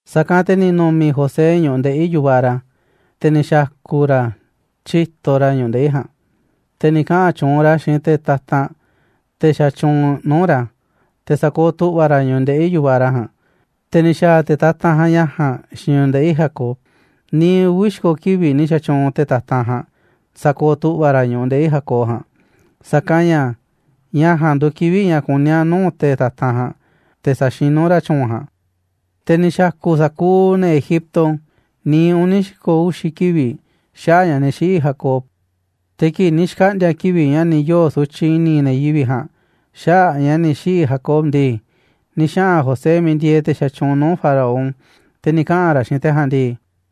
Sa̱kanꞌ te̱ ni̱ nu̱mi̱ José ñu̱ꞌuꞌ ndeꞌi̱ yu̱vaꞌ ra̱, te̱ ni̱ xa̱ku̱ ra̱ tyíto ra̱ ñu̱ꞌuꞌ ndeꞌi̱ ja̱a̱nꞌ. Te̱ ni̱ kaꞌa̱n tyuunꞌ ra̱ xiinꞌ te̱ tatanꞌ, te̱ xatyuunꞌ nuu̱ꞌ ra̱ te̱ sa̱kooꞌ tu̱ꞌva̱ ra̱ ñu̱ꞌuꞌ ndeꞌi̱ yu̱vaꞌ ra̱ ja̱a̱nꞌ, te̱ ni̱ xa̱a̱ te̱ tatanꞌ ja̱a̱nꞌ ña̱ ja̱a̱nꞌ xiinꞌ ñu̱ꞌuꞌ ndeꞌi̱ Jacob. Niiꞌ uvi̱ xi̱ko̱ kivi̱ꞌ ni̱ xa̱tyuunꞌ te̱ tatanꞌ ja̱a̱nꞌ sa̱kooꞌ tu̱ꞌva̱ ra̱ ñu̱ꞌuꞌ ndeꞌi̱ Jacob ja̱a̱nꞌ, sa̱kanꞌ ña̱ ña̱ ja̱a̱nꞌ nduuꞌ kivi̱ꞌ ña̱ kuní a̱ nuu̱ꞌ te̱ tatanꞌ ja̱a̱nꞌ te̱ sa̱xinú ra̱ tyu̱u̱n ja̱a̱nꞌ. Te̱ ni̱ xa̱ku̱ sa̱kuuꞌ ne̱ Egipto niiꞌ uni̱ xi̱ko̱ uxi̱ kivi̱ꞌ xaꞌa̱ꞌ ña̱ ni̱ xiꞌi̱ Jacob. Te̱ kii̱ꞌ ni̱ xkaꞌndi̱a̱ kivi̱ꞌ ña̱ ni̱ yoo̱ sutyiꞌ i̱ni̱ ne̱ yivi̱ꞌ ja̱a̱nꞌ xaꞌa̱ꞌ ña̱ ni̱ xiꞌi̱ Jacob ndii, ni̱ xaꞌa̱n José miiꞌ ndieeꞌ te̱ xatyuunꞌ nuu̱ꞌ Faraón, te̱ ni̱ kaꞌa̱n ra̱ xiinꞌ te̱ ja̱a̱nꞌ ndii: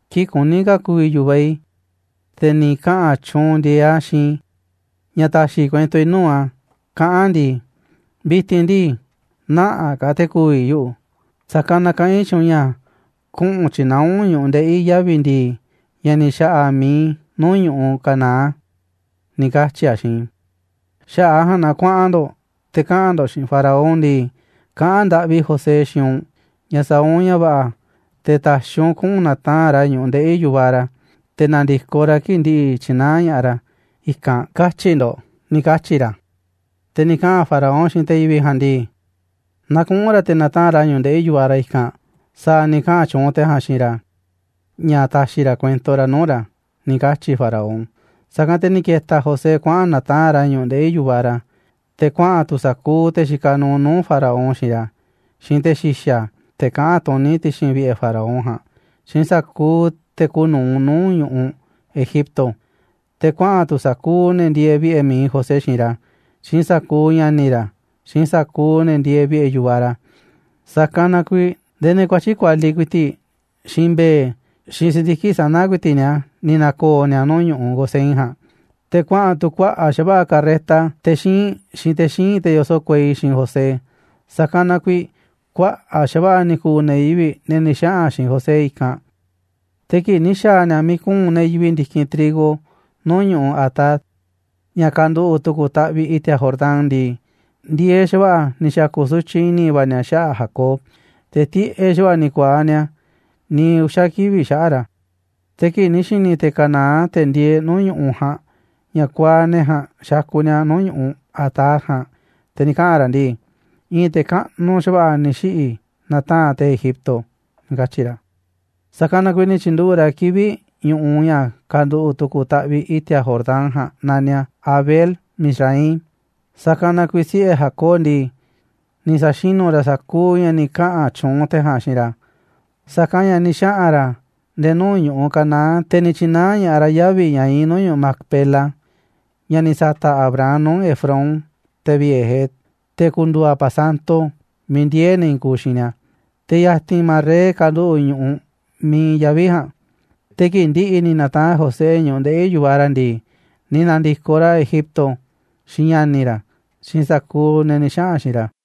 kii̱ꞌ kuní ka̱ ku̱vi̱ yu̱vaꞌ i̱, te̱ ni̱ kaꞌa̱n tyuunꞌ ndi̱e̱eꞌ a̱ xiinꞌ i̱ ña̱ ta̱xi̱ i̱ kuento i̱ nuu̱ꞌ a̱, kaꞌán a̱ ndii: “Vi̱ti̱n ndii, nä̱ꞌanꞌ ka̱ te̱ ku̱vi̱ yuꞌu̱, sa̱kanꞌ na kaꞌán i̱ xiinꞌ u̱nꞌ ña̱ kuꞌu̱n tyi̱naá u̱nꞌ ñu̱ꞌuꞌ ndeꞌi̱ i̱ yavi̱ ndi̱i̱, ña̱ ni̱ xa̱ꞌa̱ mi̱iꞌ i̱ nuu̱ꞌ ñu̱ꞌuꞌ Canaán”, ni̱ katyi̱ a̱ xiinꞌ i̱. Xaꞌa̱ꞌ a̱ ja̱a̱nꞌ na kuaꞌan ndo̱ꞌ te̱ kaꞌa̱n ndo̱ꞌ xiinꞌ Faraón ndii: “Kaꞌán ndaꞌvi José xiinꞌ u̱nꞌ ña̱ sa̱a̱ u̱nꞌ ña̱ va̱ꞌa̱ te̱ ta̱xi̱ u̱nꞌ kuꞌu̱n na̱taa̱nꞌ ra̱ ñu̱ꞌuꞌ ndeꞌi̱ yu̱vaꞌ ra̱, te̱ na̱ndi̱koꞌ ra̱ kii̱ꞌ ndi̱ꞌi̱ tyi̱naá ña̱ꞌaꞌ ra̱ i̱kanꞌ”, katyi̱ ndo̱ꞌ ―ni̱ katyi̱ ra̱ Te̱ ni̱ kaꞌa̱n Faraón xiinꞌ te̱ yivi̱ꞌ ja̱a̱nꞌ ndii: ―Na kuꞌu̱n ra̱ te̱ na̱taa̱nꞌ ra̱ ñu̱ꞌuꞌ ndeꞌi̱ yu̱vaꞌ ra̱ i̱kanꞌ, sa̱a̱ ni̱ kaꞌa̱n tyuunꞌ te̱ ja̱a̱nꞌ xiinꞌ ra̱ ña̱ ta̱xi̱ ra̱ kuento ra̱ nuu̱ꞌ ra̱ ―ni̱ katyi̱ Faraón. Sa̱kanꞌ te̱ ni̱ ke̱ta̱ José kuaꞌa̱n na̱taa̱nꞌ ra̱ ñu̱ꞌuꞌ ndeꞌi̱ yu̱vaꞌ ra̱, te̱ kuaꞌa̱n tu̱ sa̱kuuꞌ te̱ xikaꞌ nuuꞌ nuu̱ꞌ Faraón xiinꞌ ra̱, xiinꞌ te̱ xi̱xa̱, te̱ kaꞌán tuní ti̱xi̱n vi̱ꞌe̱ Faraón ja̱a̱nꞌ, xiinꞌ sa̱kuuꞌ te̱ kuuꞌ nu̱uꞌ nuu̱ꞌ ñu̱ꞌuꞌ Egipto. Te̱ kuaꞌa̱n tu̱ sa̱kuuꞌ ne̱ ndieeꞌ vi̱ꞌe̱ mi̱iꞌ José xiinꞌ ra̱, xiinꞌ sa̱kuuꞌ ña̱ni̱ ra̱, xiinꞌ sa̱kuuꞌ ne̱ ndieeꞌ vi̱ꞌe̱ yu̱vaꞌ ra̱. Sa̱kanꞌ na kuiiꞌ ndee ne̱ kuatyi̱ꞌ kualiꞌ ku̱i̱ti̱ꞌ, xiinꞌ mbe̱e̱, xiinꞌ si̱ndiki̱ꞌ sana̱ ku̱i̱ti̱ꞌ ni̱a̱ ni̱ na̱ko̱o̱ ni̱a̱ nuu̱ꞌ ñu̱ꞌuꞌ Gosén ja̱a̱nꞌ. Te̱ kuaꞌa̱n tu̱ kuaꞌa̱ꞌ xa̱va̱ꞌa̱ carreta te̱ xíinꞌ, xiinꞌ te̱ xíinꞌ, te̱ yoso̱ꞌ kuei, xiinꞌ José, sa̱kanꞌ na kuiiꞌ kuaꞌa̱ꞌ xa̱va̱ꞌa̱ ni̱ ku̱u̱ ne̱ yivi̱ꞌ, ne̱ ni̱ xaꞌa̱n xiinꞌ José i̱kanꞌ. Te̱ kii̱ꞌ ni̱ xa̱a̱ ni̱a̱ miiꞌ kuu̱nꞌ ne̱ yivi̱ꞌ ndi̱kinꞌ trigo nuu̱ꞌ ñu̱ꞌuꞌ Atad, ña̱ kanduꞌu̱ꞌ tu̱ku̱ taꞌviꞌ i̱ti̱a̱ Jordán ndii, ndi̱e̱eꞌ xa̱va̱ꞌa̱ ni̱ xa̱ku̱ sutyiꞌ i̱ni̱ va̱ ni̱a̱ xaꞌa̱ꞌ Jacob, te̱ tiꞌeꞌ xa̱va̱ꞌa̱ ni̱ ku̱a̱aꞌ ni̱a̱ niiꞌ uxa̱ kivi̱ꞌ xaꞌa̱ꞌ ra̱. Te̱ kii̱ꞌ ni̱ xi̱ni̱ te̱ Canaán, te̱ ndieeꞌ nuu̱ꞌ ñu̱ꞌuꞌ ja̱a̱nꞌ, ña̱ kuaaꞌ ne̱ ja̱a̱nꞌ xakuꞌ ni̱a̱ nuu̱ꞌ ñu̱ꞌuꞌ Atad ja̱a̱nꞌ, te̱ ni̱ kaꞌa̱n ra̱ ndii: ―I̱i̱n te̱ kaꞌnuꞌ xa̱va̱ꞌa̱ ni̱ xiꞌi̱ na̱taa̱nꞌ te̱ Egipto ―ni̱ katyi̱ ra̱. Sa̱kanꞌ na kuiiꞌ ni̱ tyi̱nduꞌu̱ꞌ ra̱ kivi̱ꞌ ñu̱ꞌuꞌ ña̱ kanduꞌu̱ꞌ tu̱ku̱ taꞌviꞌ i̱ti̱a̱ Jordán ja̱a̱nꞌ naniꞌ a̱ Abel-mizraim. Sa̱kanꞌ na kuiiꞌ siꞌe̱ Jacob ndii, ni̱ sa̱xinu̱ ra̱ sa̱kuuꞌ ña̱ ni̱ kaꞌa̱n tyuunꞌ te̱ ja̱a̱nꞌ xiinꞌ ra̱, sa̱kanꞌ ña̱ ni̱ xaꞌa̱n ra̱ nde̱e̱ nuu̱ꞌ ñu̱ꞌuꞌ Canaán, te̱ ni̱ tyi̱naá ña̱ꞌaꞌ ra̱ yavi̱ ña̱ iinꞌ nuu̱ꞌ ñu̱ꞌuꞌ Macpela, ña̱ ni̱ sa̱ta̱ꞌ Abraham nuu̱ꞌ Efrón, te̱ vi̱ꞌe̱ Het, te̱ ku̱ndu̱u̱ a̱ pasanto miiꞌ ndiee̱ ne̱ i̱i̱n kuuꞌ xiinꞌ ni̱a̱. Te̱ ya̱ti̱n Manré kanduꞌu̱ꞌ ñu̱ꞌuꞌ miiꞌ iinꞌ yavi̱ ja̱a̱nꞌ. Te̱ kii̱ꞌ ndi̱ꞌi̱ ni̱ na̱taa̱nꞌ José ñu̱ꞌuꞌ ndeꞌi̱ yu̱vaꞌ ra̱ ndii, ni̱ na̱ndi̱koꞌ ra̱ Egipto xiinꞌ ña̱ni̱ ra̱, xiinꞌ sa̱kuuꞌ ne̱ ni̱ xaꞌa̱n xiinꞌ ra̱.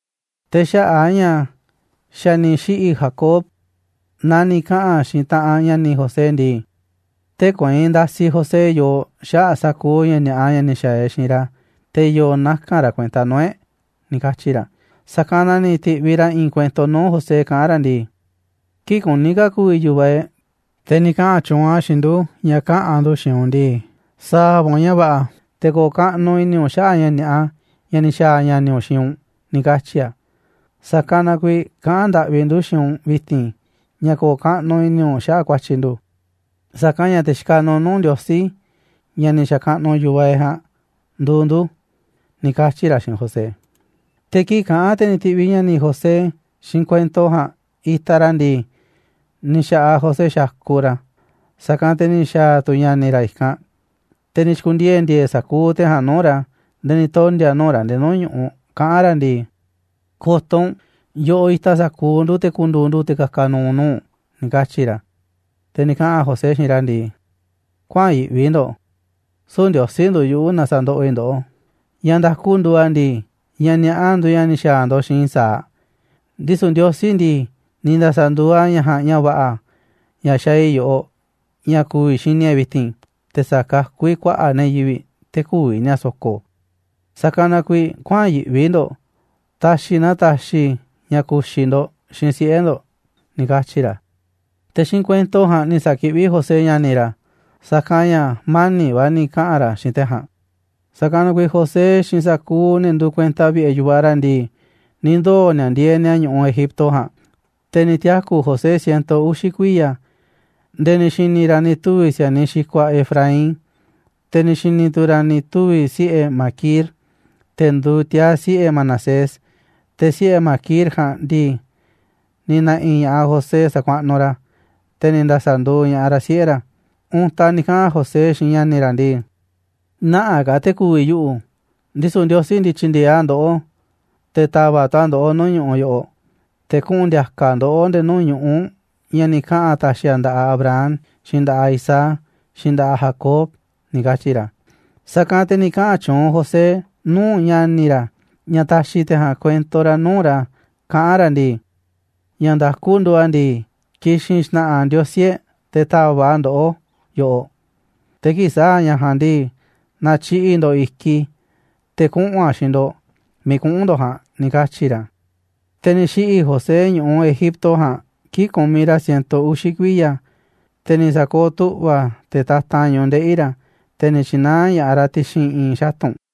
Te̱ xaꞌa̱ꞌ a̱ ña̱ xa̱ ni̱ xiꞌi̱ Jacob, na ni̱ kaꞌa̱n xiinꞌ taꞌanꞌ ña̱ni̱ José ndii: ―Tee̱ꞌ kueinꞌ ndasiꞌ José yooꞌ xaꞌa̱ꞌ sa̱kuuꞌ ña̱ ni̱a̱ꞌa ña̱ ni̱ xa̱a̱ e̱ꞌ xiinꞌ ra̱, te̱ i̱yo̱ naka̱n ra̱ kuenta nuu̱ꞌ e̱ꞌ ―ni̱ katyi̱ ra̱. Sa̱kanꞌ na ni̱ ti̱ꞌviꞌ ra̱ i̱i̱n kuento nuu̱ꞌ José kaꞌán ra̱ ndii: ―Kii̱ꞌ kuní ka̱ ku̱vi̱ yu̱vaꞌ e̱ꞌ, te̱ ni̱ kaꞌa̱n tyuunꞌ a̱ xiinꞌ ndu̱ ña̱ kaꞌa̱n ndu̱ xiinꞌ u̱nꞌ ndii: “Sa̱a̱ va̱ u̱nꞌ ña̱ va̱ꞌa̱ te̱ ko̱o̱ kaꞌnuꞌ i̱ni̱ u̱nꞌ xaꞌa̱ꞌ ña̱ ni̱a̱ꞌa ña̱ ni̱ xa̱a̱ ña̱ni̱ u̱nꞌ xiinꞌ u̱nꞌ”, ni̱ katyi̱ a̱. Sa̱kanꞌ na kuiiꞌ kaꞌán ndaꞌvi ndu̱ xiinꞌ u̱nꞌ vi̱ti̱n ña̱ ko̱o̱ kaꞌnuꞌ i̱ni̱ u̱nꞌ xaꞌa̱ꞌ ku̱a̱tyi̱ ndu̱, sa̱kanꞌ ña̱ te̱ xikaꞌ nuuꞌ nuu̱ꞌ Ndiosí, ña̱ ni̱ xa̱kaꞌnuꞌ yu̱vaꞌ e̱ꞌ ja̱a̱nꞌ, nduuꞌ ndu̱ ―ni̱ katyi̱ ra̱ xiinꞌ José. Te̱ kii̱ꞌ kaꞌán te̱ ni̱ ti̱ꞌviꞌ ña̱ni̱ José xiinꞌ kuento ja̱a̱nꞌ itaꞌ ra̱ ndii, ni̱ xa̱ꞌaꞌ José xakuꞌ ra̱. Sa̱kanꞌ te̱ ni̱ xa̱a̱ tu̱ ña̱ni̱ ra̱ i̱kanꞌ, te̱ ni̱ xi̱ku̱ndiee̱ ndi̱e̱e̱ sa̱kuuꞌ te̱ ja̱a̱nꞌ nuu̱ꞌ ra̱ nde̱e̱ ni̱ tondi̱a̱ nuu̱ꞌ ra̱ nde̱e̱ nuu̱ꞌ ñu̱ꞌuꞌ, kaꞌán ra̱ ndii: ―Ko̱to̱ u̱nꞌ, yoꞌoꞌ itaꞌ sa̱kuuꞌ ndu̱ te̱ ku̱ndu̱u̱ ndu̱ te̱ ka̱ka̱ nu̱u̱ nuu̱ꞌ u̱nꞌ ―ni̱ katyi̱ ra̱. Te̱ ni̱ kaꞌa̱n José xiinꞌ ra̱ ndii: ―Kuäa̱n yi̱ꞌvi ndo̱ꞌ, süu̱ꞌ Ndiosí nduuꞌ yuꞌu̱ na sa̱ndoꞌoꞌ i̱ ndoꞌó. Ña̱ nda̱ku nduuꞌ a̱ ndii, ña̱ ni̱a̱ꞌa nduuꞌ ña̱ ni̱ xa̱a̱ ndo̱ꞌ xiinꞌ i̱ sa̱aꞌ, ndisu̱ Ndiosí ndii, ni̱ nda̱sa̱nduuꞌ a̱ ña̱ ja̱a̱nꞌ ña̱ va̱ꞌa̱, ña̱ xaaꞌ i̱ yoꞌoꞌ ña̱ ku̱vi̱ xini e̱ꞌ vi̱ti̱n, te̱ sa̱kakú i̱ kuaꞌa̱ꞌ ne̱ yivi̱ꞌ, te̱ kü̱vi̱ ni̱a̱ so̱ko̱. Sa̱kanꞌ na kuiiꞌ kuäa̱n yiꞌvi ndo̱ꞌ, ta̱xi̱ na taxiꞌ i̱ ña̱ ku̱xi̱ ndo̱ꞌ, xiinꞌ siꞌe̱ ndo̱ꞌ ―ni̱ katyi̱ ra̱. Te̱ xiinꞌ kuento ja̱a̱nꞌ ni̱ sa̱kiꞌví José ña̱ni̱ ra̱, sa̱kanꞌ ña̱ mani̱ꞌ va̱ ni̱ kaꞌa̱n ra̱ xiinꞌ te̱ ja̱a̱nꞌ. Sa̱kanꞌ na kuiiꞌ José xiinꞌ sa̱kuuꞌ ne̱ nduuꞌ kuenta vi̱ꞌe̱ yu̱vaꞌ ra̱ ndii, ni̱ ndoo̱ ni̱a̱ ndieeꞌ ni̱a̱ ñu̱ꞌuꞌ Egipto ja̱a̱nꞌ. Te̱ ni̱ tiaku̱ José ciento uxi̱ kuiya̱, nde̱e̱ ni̱ xi̱ni̱ ra̱ ni̱ tuvi̱ si̱a̱niꞌ xikuaꞌ Efraín, te̱ ni̱ xi̱ni̱ tu̱ ra̱ ni̱ tuvi̱ siꞌe̱ Maquir, te̱ nduuꞌ tiaa̱ siꞌe̱ Manasés, te̱ siꞌe̱ Maquir ja̱a̱nꞌ ndii, ni̱ na̱ꞌi̱ ña̱ꞌaꞌ José sa̱kuaꞌnuꞌ ra̱, te̱ ni̱ nda̱sa̱nduuꞌ ña̱ꞌaꞌ ra̱ siꞌe̱ ra̱. Untaꞌ ni̱ kaꞌa̱n José xiinꞌ ña̱ni̱ ra̱ ndii: ―Nä̱ꞌanꞌ ka̱ te̱ ku̱vi̱ yuꞌu̱, ndisu̱ Ndiosí ndii, tyi̱ndi̱e̱eꞌ a̱ ndoꞌó, te̱ ta̱va̱ꞌ tu̱ a̱ ndoꞌó nuu̱ꞌ ñu̱ꞌuꞌ yoꞌoꞌ, te̱ kuꞌu̱n ndi̱a̱ka̱ a̱ ndoꞌó nde̱e̱ nuu̱ꞌ ñu̱ꞌuꞌ ña̱ ni̱ kaꞌa̱n a̱ ta̱xi̱ a̱ nda̱ꞌaꞌ Abraham, xiinꞌ nda̱ꞌaꞌ Isaac, xiinꞌ nda̱ꞌaꞌ Jacob ―ni̱ katyi̱ ra̱. Sa̱kanꞌ te̱ ni̱ kaꞌa̱n tyuunꞌ José nuu̱ꞌ ña̱ni̱ ra̱ ña̱ ta̱xi̱ te̱ ja̱a̱nꞌ kuento ra̱ nuu̱ꞌ ra̱ kaꞌán ra̱ ndii: ―Ña̱ nda̱ku nduuꞌ a̱ ndii, ki̱xi̱n xna̱ꞌa̱ Ndiosí e̱ꞌ te̱ ta̱va̱ꞌ a̱ ndoꞌó yoꞌoꞌ, te̱ kii̱ꞌ sa̱a̱ a̱ ña̱ ja̱a̱nꞌ ndii, na̱tyiꞌi̱ꞌ ndo̱ꞌ i̱kiꞌ i̱ te̱ kuꞌu̱n a̱ xiinꞌ ndo̱ꞌ miiꞌ kuꞌu̱n ndo̱ꞌ ja̱a̱nꞌ ―ni̱ katyi̱ ra̱. Te̱ ni̱ xiꞌi̱ José ñu̱ꞌuꞌ Egipto ja̱a̱nꞌ kii̱ꞌ kumiꞌ ra̱ ciento uxi̱ kuiya̱, te̱ ni̱ sa̱kooꞌ tu̱ꞌva̱ te̱ tatanꞌ ñu̱ꞌuꞌ ndeꞌi̱ ra̱, te̱ ni̱ tyi̱naá ña̱ꞌaꞌ ra̱ ti̱xi̱n i̱i̱n xatu̱nꞌ.